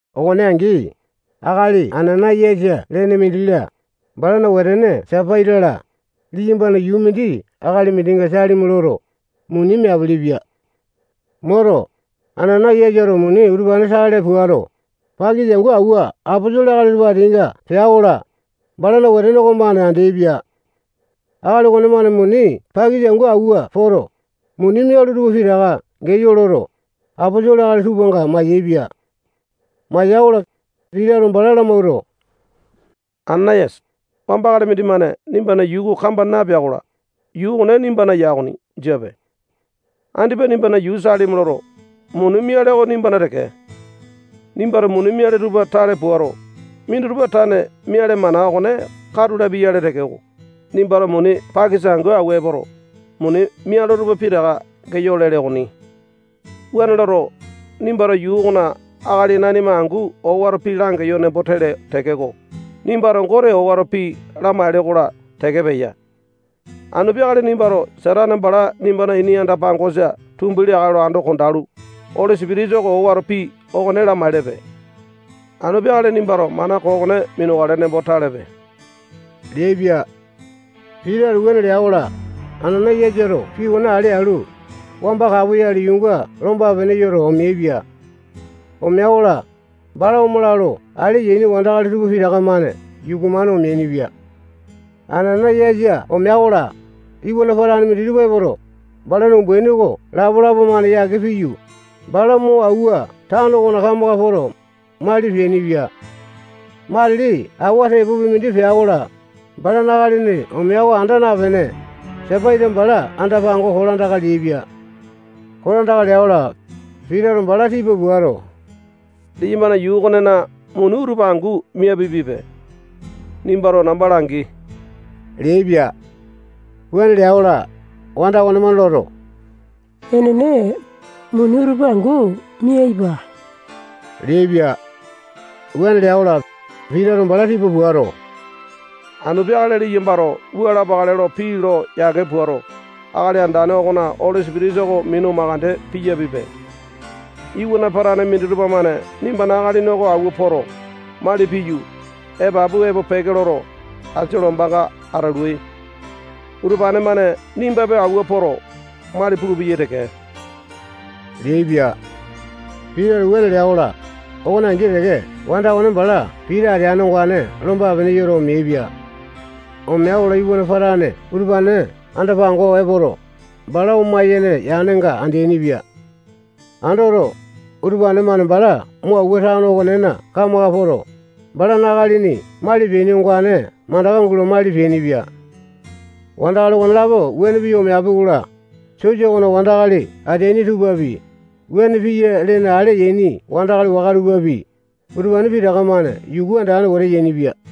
Okone angi, akali Anana-yasa lene mindi-la, balana wetene Sapaita-la, liyambana yuu mindi akali mindinga salimi loto, muni meapili-pia. Moto, Anana-yasato muni utupane tale puato, pakisa angu awua aposolo akali tupa ateainga pea-kola, balana wetene okomane andeaipia. Akali okonemane muni pakisa angu awua poto, muni mialo tupa pitaka geyo loto, aposolo akali tupanga mayaepia. Maya-kola, Pitato bala lamawuato, Anana-yasa, wamba akali mindimane nimbana yuu oko kamba napea-kola, yuu okone nimbana ya okoni, jiape. Andipa nimbana yuu salimi loto, muni miale oko nimbana teke. Nimbato muni miale tupa tale puato, minditupa tane miale mana okone katu lapia-yale tekeko, nimbato muni pakisa angu awua epoto, muni mialo tupa pitaka geyo lele okoni. Wuane loto, nimbato yuu okona akali nanima angu owato pii langeyo nembo tele tekeko, nimbato Gote owato pii lamaele-kola teke peya. Anu peakale nimbato Satane bala nimbana ini anda-pangosa tumbi leakale lo ando kondalu, Oli Sipitisa oko owato pii okone lamaelepe. Anu peakale nimbato mana koo okone minukale nembo talepe leaipia. Pitato wuane lea-kola, Anana-yasato pii okone ale alu, wamba kapoyale yuunga lomba-pene yoto, omeaipia. Omea-kola, bala omala lo ale yaini wandakali tupa pitaka-mane yuku-mane omeainipia. Anana-yasa omea-kola, iwana patane minditupa epoto, balana umbaini oko lapalapa-mane yake piyu, bala mo awua tano okona kamaka poto, mali peainipia. Matili awa tepopi mindi pea-kola, balana akalini omea oko anda napene, Sapaita bala anda-pango kolandaka leaipia. Kolandaka lea-kola, Pitato bala tipa puato, liyambana yuu okonena muni utupa angu miapiapipe. Nimbato namba langi leaipia. Wuane lea-kola, wanda okonemane loto, enene, muni utupa angu miaipa leaipia. Wuane lea-kola, Pitato bala tipa puato, anu peakale liyambato wua lapakale lo pii lo yake puato, Akali Andane okona Oli Sipitisa oko minu makande piyapipe. Iwana patane minditupa-mane nimbana akalini oko awua poto, mali piyu, epapu epo peke loto, asia lombanga atalui. Utupane-mane nimbapi awua poto, mali pulupeyai teke leaipia. Pitato wuane lea-kola, okone angi teke wanda okone bala Pita ateane ongane lomba-pene yoto, omeaipia. Omea-kola, iwana patane utupane anda-pango epoto, bala oma-yene yanga andeaini-pia. Andoto, utupane-mane bala mo awua tano okonena kamaka poto, balana akalini mali peaini ongane mandaka gulo mali peainipia. Wandakali okonelapo wuane piyu, omeapi-kola, sosa okona wandakali ateaini tupapi, wuane piya lene ale yaini wandakali waka tupapi, utupane pitaka-mane yuku andane wete yainipia.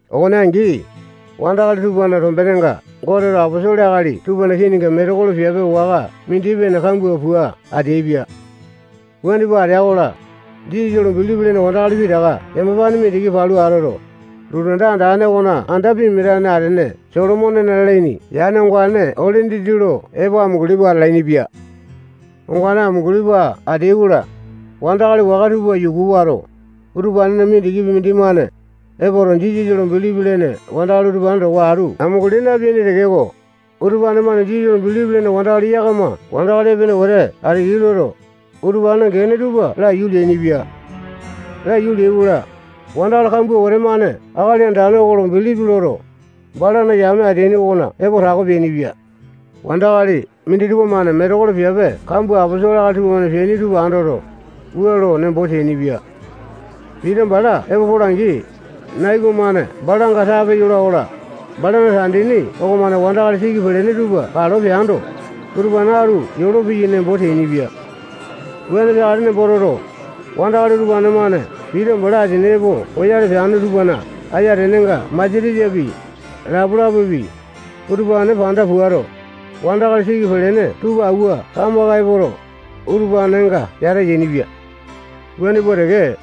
Okone angi, wandakali tupana tombenenga Goteto aposolo akali tupana kininga metekolo piape waka mindi-pene kambua pua ateaipia. Wuane pua atea-kola, Jisasa lo bilipi lene wandakali pitaka yamapane mindiki palu atoto, lotu anda andane okona anda pimia atane atene Solomonena lalaini yane ongane ole dindi lo epo amunguli pua atalainipia. Ongane amunguli pua ateai-kola, wandakali waka tupa yuku wato, utupanena mindikipi mindimane epoto, Jisasa lo bilipi lene wandakali utupane towa atu amunguli napeaini tekeko, utupane-mane Jisasa lo bilipi lene wandakali yakama wandakali epene wete ateyai loto, utupanena gene tupa laiyu leainipia. Laiyu leai-kola, wandakali kambua wete-mane Akali Andane oko lo bilipi loto, balana yame ateaini okona epo tako peainipia. Wandakali minditupa-mane metekolo piape kambua aposolo akali tupamane peaini tupa andoto, wua lo nembo teainipia: Pita bala epo pola-angi, nai okomane balanga tape yola-kola, balana tandini okomane wandakali siki pelene tupa kalo peando, utupane atu yolopeyai nembo teainipia. Wuane peakale nembo toto, wandakali utupane-mane Pita bala asini epo poyale peane tupana ayatenenga masatesapi, lapalapapi, utupane panda puato, wandakali siki pelene tupa awua kamaka epoto, utupanenga yata yainipia. Wuane pua teke,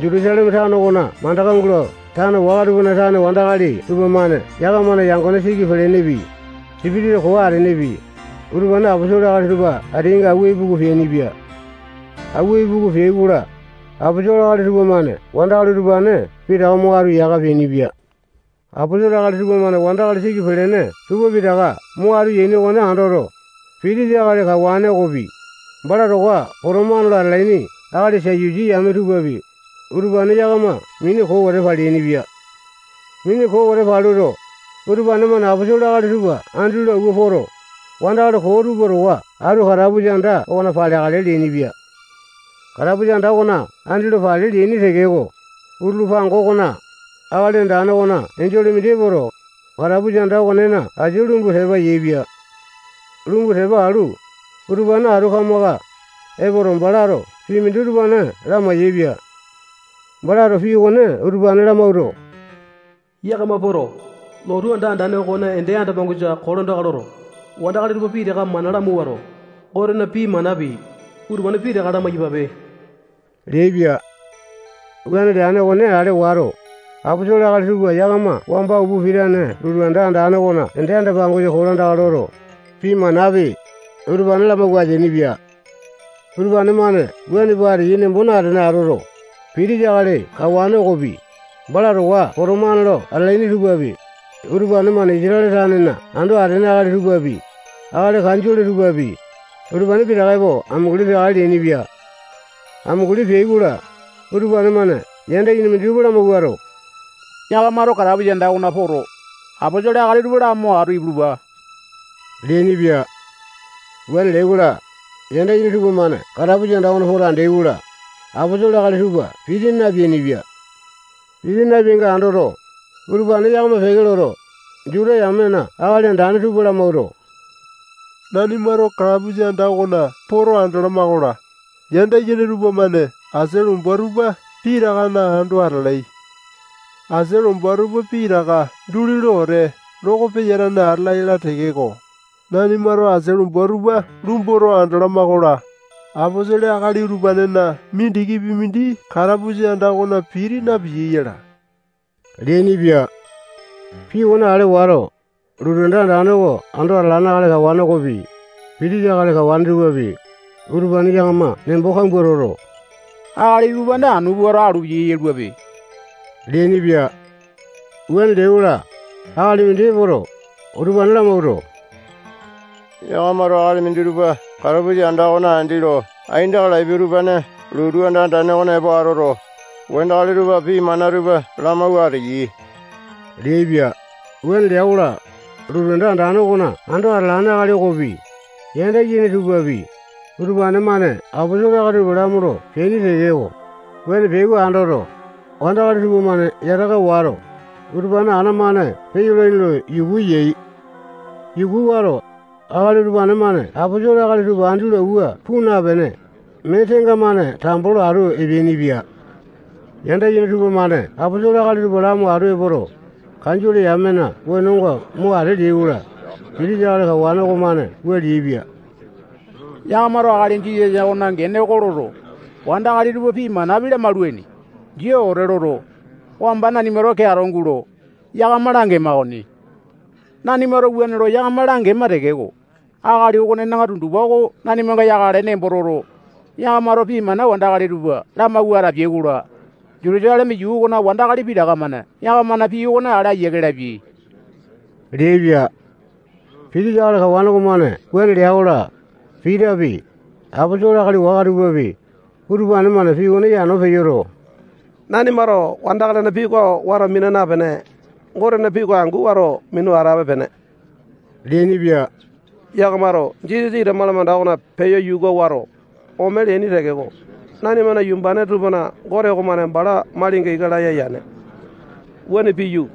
Jutusaleme tano okona mandaka gulo tano waka tupana tane wandakali tupamane yakamana yangone siki pelenepi, sipitisa koo atenepi, utupane aposolo akali tupa ateainga awua ipuku peainipia. Awua ipuku peai-kola, aposolo akali tupamane wandakali utupane pitaka mo atu yaka peainipia. Aposolo akali tupamane wandakali siki peleaini tupa pitaka mo atu yaini okone andoto, pitisa akali kawane okopi, bala towa potomane lo atalaini akali Satusi yame tupapi, utupane yakama mini koo wete paleainipia. Mini koo wete paluto, utupane-mane aposolo akali tupa andi lo awua poto, wandakali koo tupa towa atu katapusa anda okona paleakale leainipia. Katapusa anda okona andi lo pale leaini tekeko, utulu pango okona, Akali Andane okona enjole mindi epoto, katapusa anda okonena asia lumbu tepa yaepia. Lumbu tepa alu, utupane atu kamaka epoto, balato pii mindi utupane lamai-yaepia. Balato pii okone utupa lamawuato, yakama poto, lotu anda andane okona ende anda-pangosa kolandaka loto, wandakali tupa pitaka mana lamawuato, Gotena pii manapi, utupane pitaka lamai-yapape leaipia. Wuane leane okone ale wato, aposolo akali tupa yakama wamba upa pitane lotu anda andane okona ende anda-pangosa kolandaka loto, pii manapi, utupane lamawua ateainipia. Utupane-mane wuane pua ateyai nembo natene atoto, pitisa akali kawane okopi, bala towa potomane lo atalaini tupapi, utupane-mane Isatale tanena ando atene akali tupapi, akali kanjole tupapi, utupane pitaka epo amunguli peakale leainipia. Amunguli peai-kola, utupane-mane yanda yene minditupa lamawuato, yakamato katapusa anda okona poto, aposolo akali tupa lamo atu ipulupa leainipia. Wuane leai-kola, yanda yene tupamane katapusa anda okona poto andeai-kola, aposolo akali tupa piti napeainipia. Piti napeainga andoto, utupane yakama peke loto, Juta yamena akali andane tupa lamawuato, nanimato katapusa anda okona poto andalama-kola, yanda yene tupamane asia lomba tupa pitakana ando atalai. Asia lomba tupa pitaka duli lo wete loko peyatane atala yala tekeko, nanimato asia lomba tupa lumboto andalama-kola, aposolo akali utupanena mindikipi mindi katapusa anda okona piti napiyai yala leainipia. Pii okone ale wato, lotu anda andane oko ando atalane akali kawane okopi, pitisa akali kawane tupapi, utupane yakama nembo kambua toto, akali utupane anu puato, alu piyai yaluape leainipia. Wuane leai-kola, akali mindi epoto, utupane lamawuato, yakamato akali minditupa katapusa anda okona andi lo aindaka lapiai utupane lotu anda andane okona epo atoto, wandakali tupa pii mana tupa lamawua ateyai leaipia. Wuane lea-kola, lotu anda andane okona ando atalane akali okopi, yanda yene tupapi, utupane-mane aposolo akali utupane lamolo peaini tekeko, wuane peyai oko andoto, wandakali tupamane yataka wato, utupane ana-mane peyolaini lo yuku yai. Yuku wato, akali utupane-mane aposolo akali tupa andi lo awua puu napene, mee tenga-mane tambo lo atu epeainipia. Yanda yene tupamane aposolo akali tupa lamo atu epoto, kanjole yamena wenonga mo ate leai-kola, pitisa akali kawane okomane wua leaipia: Yakamato akali Jisasa okonena gene oko loto, wandakali tupa pii manapi lamaulaini, jia wete loto, wamba nanimato keato gulo, yakama langema okoni. Nanimato wuane lo yakama langema tekeko, akali okonena tundupa oko nanimanga yakale nembo toto, yakamato pii mana wandakali tupa lamawua atapiai-kola, Jutusaleme yuu okona wandakali pitaka-mane yakamana pii okone ale ayiake lapiai leaipia. Pitisa akali kawane okomane wuane lea-kola, Pitapi, aposolo akali waka tupapi, utupane-mane pii okone yano peyoto, nanimato wandakalina pii oko wato mina napene, Gotena pii oko angu wato minu atape-pene leainipia. Yakamato Jisasa ita malamanda okona peyo yuka wato, ome leaini tekeko, nanimana yumbane tupana Gote okomane bala malinga ika laya yane. Wuane piyu,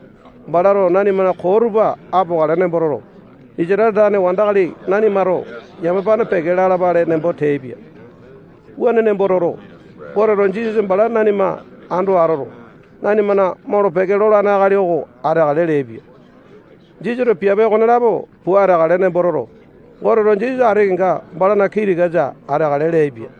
balato nanimana koo tupa apokale nembo toto, Isatale tane wandakali nanimato yamapane peke lalapale nembo teaipia. Wuane nembo toto, Goteto Jisasa bala nanima ando atoto, nanima molo-peke lolane akali oko ateakale leaipia. Jisasato piape okonelapo pua ateakale nembo toto, Goteto Jisasa ati kenga balana kii tikasa ateakale leaipia.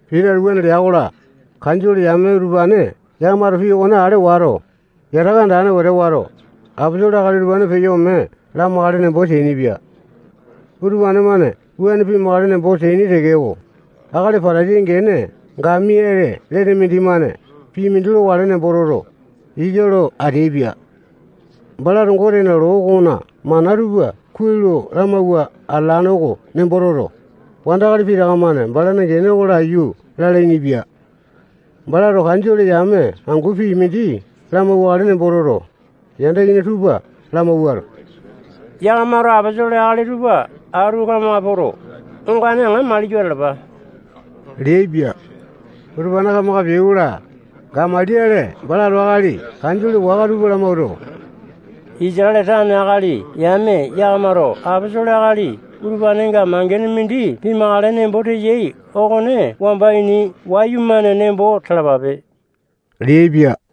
Pitato wuane lea-kola, kanjole yame utupane yakamato pii okone ale wato, yataka andane wete wato, aposolo akali tupa peyo ome lamakale nembo teainipia. Utupane-mane wuane pimakale nembo teaini tekeko, akali Patasai gene Gamaliale lene mindimane pii mindi lokale nembo toto, ika lo ateaipia. Balato Gotena loo okona mana tupa kuai lo lamawua atalane oko nembo toto, wandakali pitaka-mane balana gene oko laiyu lalainipia. Balato kanjole yame angu pii mindi lamauwakale nembo toto, yanda yene tupa lamawuato, yakamato aposolo akali tupa atu kamaka poto, ongane aŋa maliyo atalapa leaipia. Utupane kamaka peai-kola, Gamaliale balato akali kanjole waka tupa lamawuato, Isatale tane akali yame yakamato aposolo akali utupanenga mangene mindi pimakale nembo teyai okone wamba ini wayumane nembo talapape leaipia.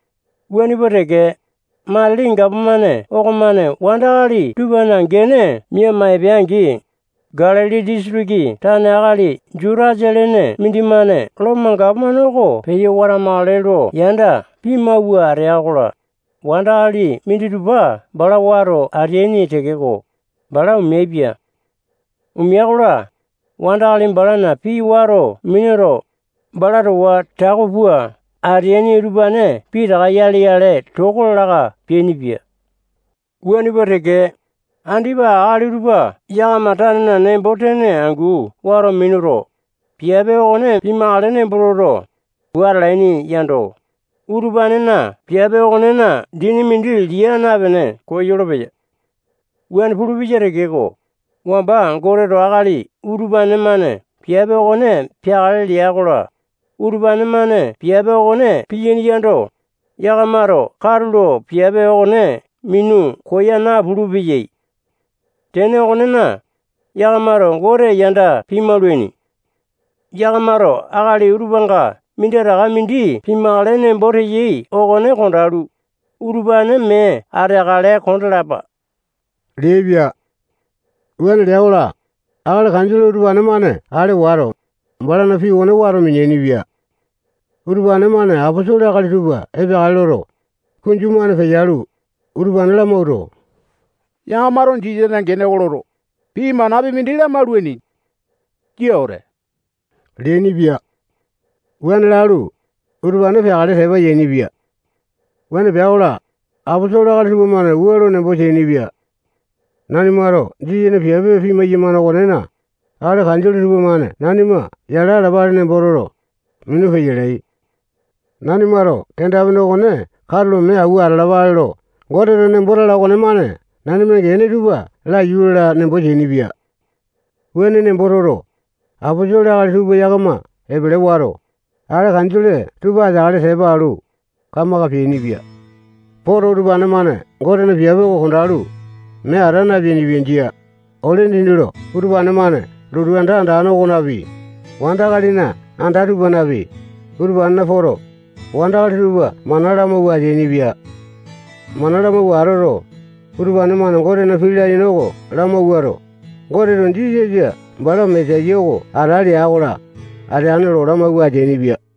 Wuane pua teke, matili gapomane okomane wandakali tupana gene miama epea-angi, Galili disitiki tane akali Jutasa lene mindimane Lomo gapomane oko peyo watamakale lo yanda pimawua atea-kola, wandakali minditupa bala wato ateaini tekeko, bala omeaipia. Omea-kola, wandakali balana pii wato minuto, bala towa tako pua ateaini utupane pitaka yale-yale toko laka peainipia. Wuane pua teke, andipa akali utupa yakama tanena nembo-tene angu wato minuto, piape okone pimakale nembo toto, pua atalaini yando, utupanena piape okonena dini mindi lia napene koyolo-peya. Wuane pulupeya tekeko, wamba Goteto akali utupane-mane piape okone peakale lea-kola, utupane-mane piape okone piyaini yando, yakamato katulo piape okone minu koya napulu-peyai. Tene okonena, yakamato Gote yanda pimaulaini. Yakamato akali utupanga minditaka mindi pimakale nembo teyai okone kondalu, utupane mee ateakale kondalapa leaipia. Wuane lea-kola, akali kanjole utupane-mane ale wato, balana pii okone wato mineaini-pia. Utupane-mane aposolo akali tupa epeakale loto, kunju-mane peyalu, utupane lamawuato, yakamato Jisasana gene oko loto, pii manapi mindi lamaulaini. Jia wete leainipia. Wuane lalu, utupane peakale tepa yainipia. Wuane pea-kola, aposolo akali tupamane wua lo nembo teainipia: Nanimato Jisasana piape pimai-yamane okonena, akali kanjole tupamane nanima yala alapale nembo toto, minu peyalai. Nanimato kenda-pene okone katulo mee awua atolo-peyama lo Goteto nembo tala okonemane nanimana gene tupa laiyu lala nembo teainipia. Wuane nembo toto, aposolo akali tupa yakama epele wato, akali kanjole tupa ateakale tepa alu, kamaka peainipia. Poto, utupane-mane Gotena piape oko kondalu, mee ata napeainipia. Jia. Ole dindi lo utupane-mane lotu anda andane okonapi, wandakalina anda tupanapi, utupanena poto, wandakali tupa mana lamawua ateainipia. Mana lamawua atoto, utupane-mane Gotena pii layene oko lamawuato, Goteto Jisasa bala Mesaya oko ata lea-kola, ateane lo lamawua ateainipia.